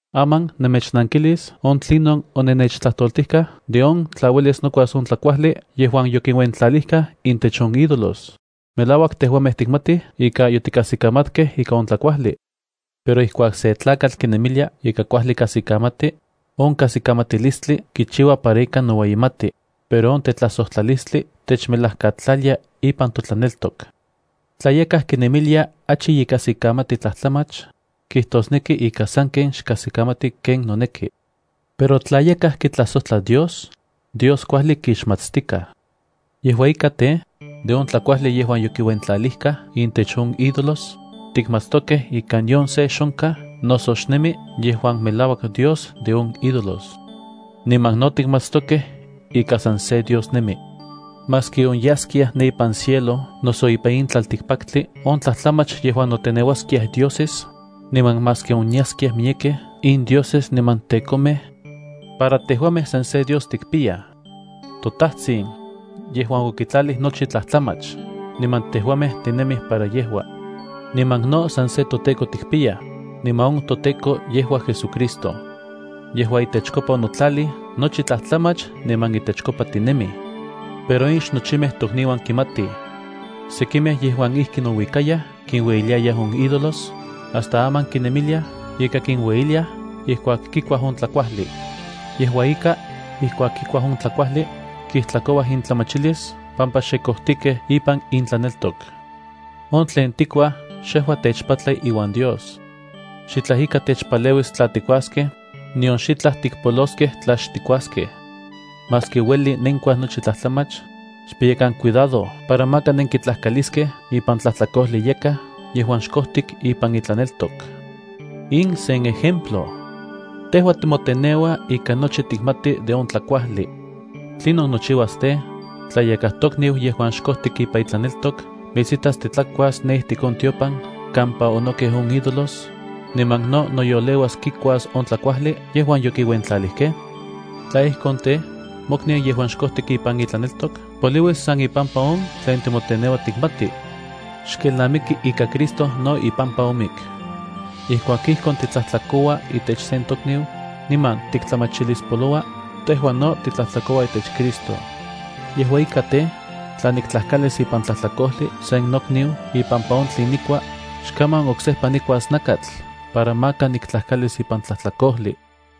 Aman nemechnankilis on tlinon onennechtlatoltijkaj de on tla uelis nokuas on tlakuajli yejuan yokiuentlalijkaj intech on ídolos. Melauak tejuamej tikmatij ika yotikajsikamatkej ika on tlakuajli. Pero ijkuak sen tlakatl kinemilia ika kuajli kajsikamati, on kajsikamatilistli kichiua para ika noueyimati, pero on tetlajsojtlalistli techmelajkatlalia ipan totlaneltok. Tla yakaj kinemilia achi ye kajsikamati tlajtlamach, kijtosneki ika sanken xkajsikamati ken noneki. Pero tla yakaj kitlajsojtla Dios, Dios kuajli kixmatstikaj. Yejua ika tej, de on tlakuajli yejuan yokiuentlalijkaj intech on ídolos, tikmatstokej ika nion se xonkaj noso xnemi yejuan melauak dios de on ídolos. Niman no tikmatstokej ika san se Dios nemi. Maski onyaskiaj ne ipan cielo noso ipan in tlaltikpaktli on tlajtlamach yejuan noteneuaskiaj dioses, niman maski onyaskiaj miyekej in dioses niman tekomej, para tejuamej san se Dios tikpiyaj. Yejua toTajtsin yejuan okitlalij nochi tlajtlamach, niman tejuamej tinemij para yejua. Niman no san se toTEKO tikpiya, niman on toTEKO yejua JesuCristo. Yejua itechkopa onotlalij nochi tlajtlamach niman itechkopa tinemij. Pero in xnochimej tokniuan kimatij. Sekimej yejuan ijki nouikayaj kinueyiliayaj on ídolos, hasta aman kinemiliaj ika kinueyiliaj ijkuak kikuaj on tlakuajli. Yejua ika, ijkuak kikuaj on tlakuajli, kijtlakouaj intlamachilis pampa xe kojtikej ipan intlaneltok. On tlen tikuaj xejua techpatla iuan Dios. Xitlaj ika techpaleuis tla tikuaskej, nion xitlaj tikpoloskej tla xtikuaskej. Maski ueli nenkuaj nochi tlajtlamach, xpiyakan cuidado para maka nenkitlajkaliskej ipan tlajtlakojli yakaj yejuan xkojtik ipan itlaneltok. In sen ejemplo. Tejua timoteneua ika nochi tikmati de on tlakuajli. ¿Tlinon nochiuas tej, tla yakaj tokniu yejuan xkojtik ipan itlaneltok mitsitas titlakuas ne ijtik on tiopan kampa onokej on ídolos, niman no noyoleuas kikuas on tlakuajli yejuan yokiuentlalijkej? Tla ijkon tej, mokniu yejuan xkojtik ipan itlaneltok poliuis san ipampa on tlen timoteneua tikmati. Xkelnamiki ika Cristo no ipampa omik. Ijkuak ijkon titlajtlakoua itech sen tokniu, niman tiktlamachilispoloua, tejua no titlajtlakoua itech Cristo. Yejua ika tej, tla niktlajkalis ipan tlajtlakojli sen nokniu ipampa on tlen nikua, xkaman oksejpa nikuas nakatl para maka niktlajkalis ipan tlajtlakojli.